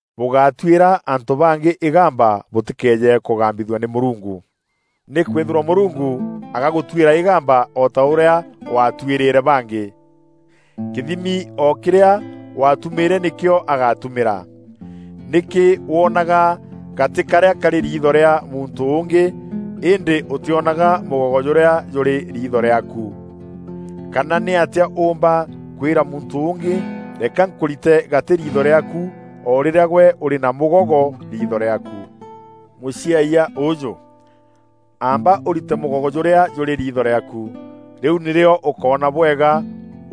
“Bûgátuîra antû bangî îgamba bûtîkeeje kûgambithua nî Mûrungu. Nîkwîthîrwa Mûrungu agagûtuîra îgamba o ta ûrîa waatuîrîre bangî. Kîthimi o kîrîa waatumîîre nîkîo agatumîra. Nîkî woonaga gatî karîa karî riitho rîa muntû ûngî îndî ûtîonaga mûgogo jûrîa jûrî riitho rîaaku? Kana nîatîa ûûmba kwîra muntû ûngî, ‘Reka nkûrîte gatî riitho rîaaku,’ o rîrîa gwe ûrî na mûgogo riitho rîaaku? Mûciayia ûjû! Amba ûrîte mûgogo jûrîa jûrî riitho rîaaku, rîu nîrîo ûkoona bwega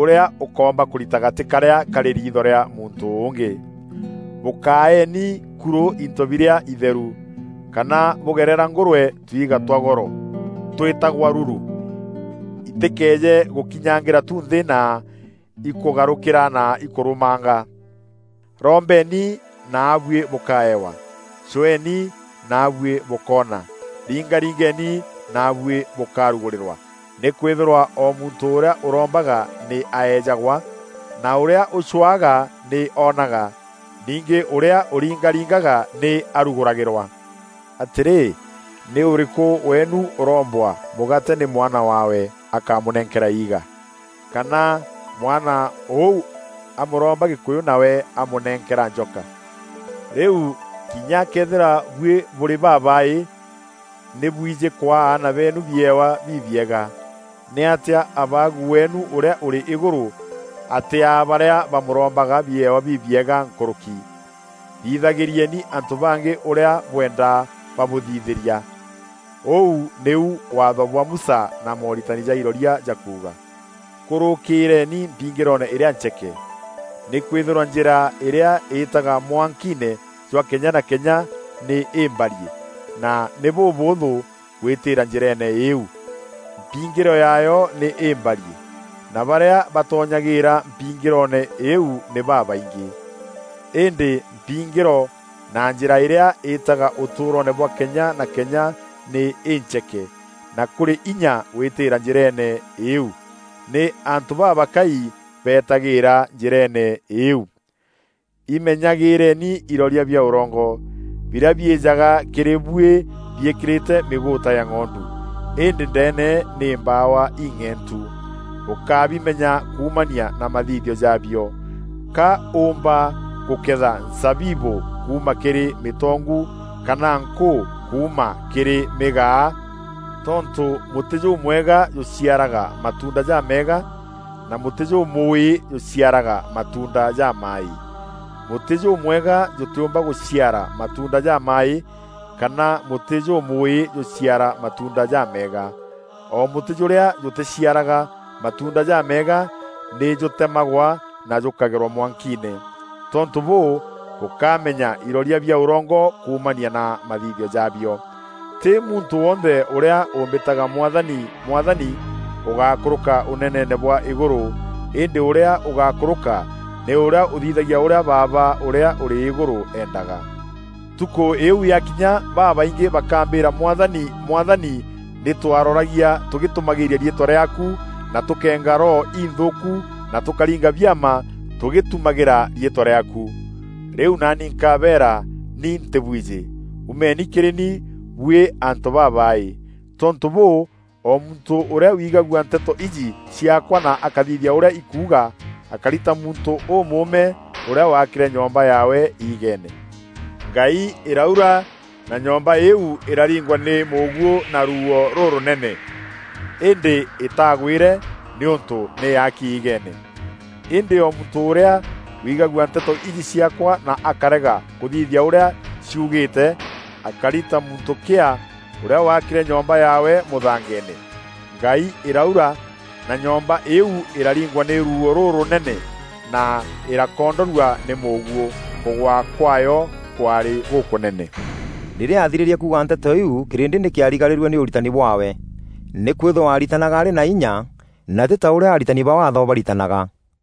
ûrîa ûkoomba kûrita gatî karîa karî riitho rîa muntû ûngî. “Bûkaeeni kurû into birîa itheru, kana bûgerera ngûrwe tuiga twa goro, twîtagwa lulu, itîkeeje gûkinyangîra tu nthî na ikûgarûkîra na ikûrûmanga.” “Rombeni naabuî bûkaewa; cweeni naabuî bûkoona; ringaringeni naabuî bûkarugûrîrwa. Nîkwîthîrwa o muntû ûrîa ûrombaga nî aejagwa, na ûrîa ûcwaga nî oonaga, ningî ûrîa ûringaringaga nî arugûragîrwa. Atîrî, nî ûrîkû weenu ûrombwa mûgaate nî mwana waawe, akamûnenkera iiga? Kana mwana ûu amûromba gîkûyû nawe amûnenkera njoka? Rîu kinya këethîra buî bûrî babaaî, nî bwijî kwaa aana beenu biewa bibiega, nîatîa Abaagu weenu ûrîa ûrî îgûrû atîaa barîa bamûrombaga biewa bibiega nkûrûki? Thithagîrieni antû bangî ûrîa bwenda babûthithîria. Ûu nîu Waatho bwa Musa na mooritani ja iroria jakuuga.” “Kûrûkîîreeni mpingîroone îrîa ncheeke. Nîkwîthîrwa njîra îrîa îîtaga mwankiine jwa kenya na kenya nî îmbariî na nî bûbûûthû gwîtîîra njîreene îîu; mpingîro yaayo nî îmbariî, na barîa batonyagîîra mpingîroone îîu nî babaingî. Îndî mpingîro na njîra îrîa îîtaga ûtûûroone bwa kenya na kenya nî încheke na kûrî inya gwîtîîra njîreene îîu; nî antû babakai beetagîîra njîreene îîu.” “Imenyagîîreeni iroria bia ûrongo, birîa biîjaga kîrî buî biîkîrîte mîgûûta ya ng'ondu, îndî ndeene nî mbawa ing'eentu. Bûkabimenya kuumania na mathithio jaabio. Ka ûûmba gûketha nzabibû kuuma kîrî mîtongu kana nkûû kuuma kîrî mîgaa? Tontû mûtî jûmwega jûciaraga matuunda jameega na mûtî jûmûûî jûciaraga matuunda jamaaî. Mûtî jûmwega jûtîûmba gûciara matuunda jamaaî kana mûtî jûmûûî jûciara matuunda jameega. O mûtî jûrîa jûtîciaraga matuunda jameega nî jûtemagwa na jûkagerwa mwankiine. Tontû bûû, bûkamenya iroria bia ûrongo kuumania na mathithio jaabio.” “Tî muntû wonthe ûrîa ûmbîtaga ‘Mwathani, Mwathani,’ ûgakûrûka ûneneene bwa îgûrû, Îndî ûrîa ûgakûrûka nî ûrîa ûthithagia ûrîa Baaba ûrîa ûrî îgûrû eendaga. Ntukû îîu yakinya babaingî bakambîîra ‘Mwathani, Mwathani! Nî twaroragia tûgîtumagîra riîtwa rîaaku na tûkeenga roho inthûûku na tûkaringa biama tûgîtumagîra riîtwa rîaaku.’ Rîu naani nkabeera: ‘Ni ntîbwijî. Umeni kîrî ni buî antû babaaî!’” “Tontû bûû, o muntû ûrîa wigagua nteto iji ciaakwa na akathithia ûrîa ikuuga, akari ta muntû ûmûûme ûrîa waakîre nyomba yaawe iigeene. Ngai îraura, na nyomba îîu îrariingwa nî mûguû na ruuo rûrûnene, îndî îtaagwîre nîûntû nî yaaki iigeene. “Îndî o muntû ûrîa wigagua nteto iji ciaakwa na akarega kûthithia ûrîa ciugîte, akari ta muntû kîaa ûrîa waakîre nyomba yaawe mûthangeene. Ngai îraura, na nyomba îîu îraringwa nî ruuo rûrûnene na îrakoondorua nî mûguû. Kûgwa kwaayo kwaarî gûkûnene.” Rîrîa aathirîrie kuuga nteto iu, kîrîndî nî kîarigarîrue nî ûritani bwaawe, nîkwîthîrwa aaritanaga arî na inya, na tî ta ûrîa aritani ba Waatho baaritanaga.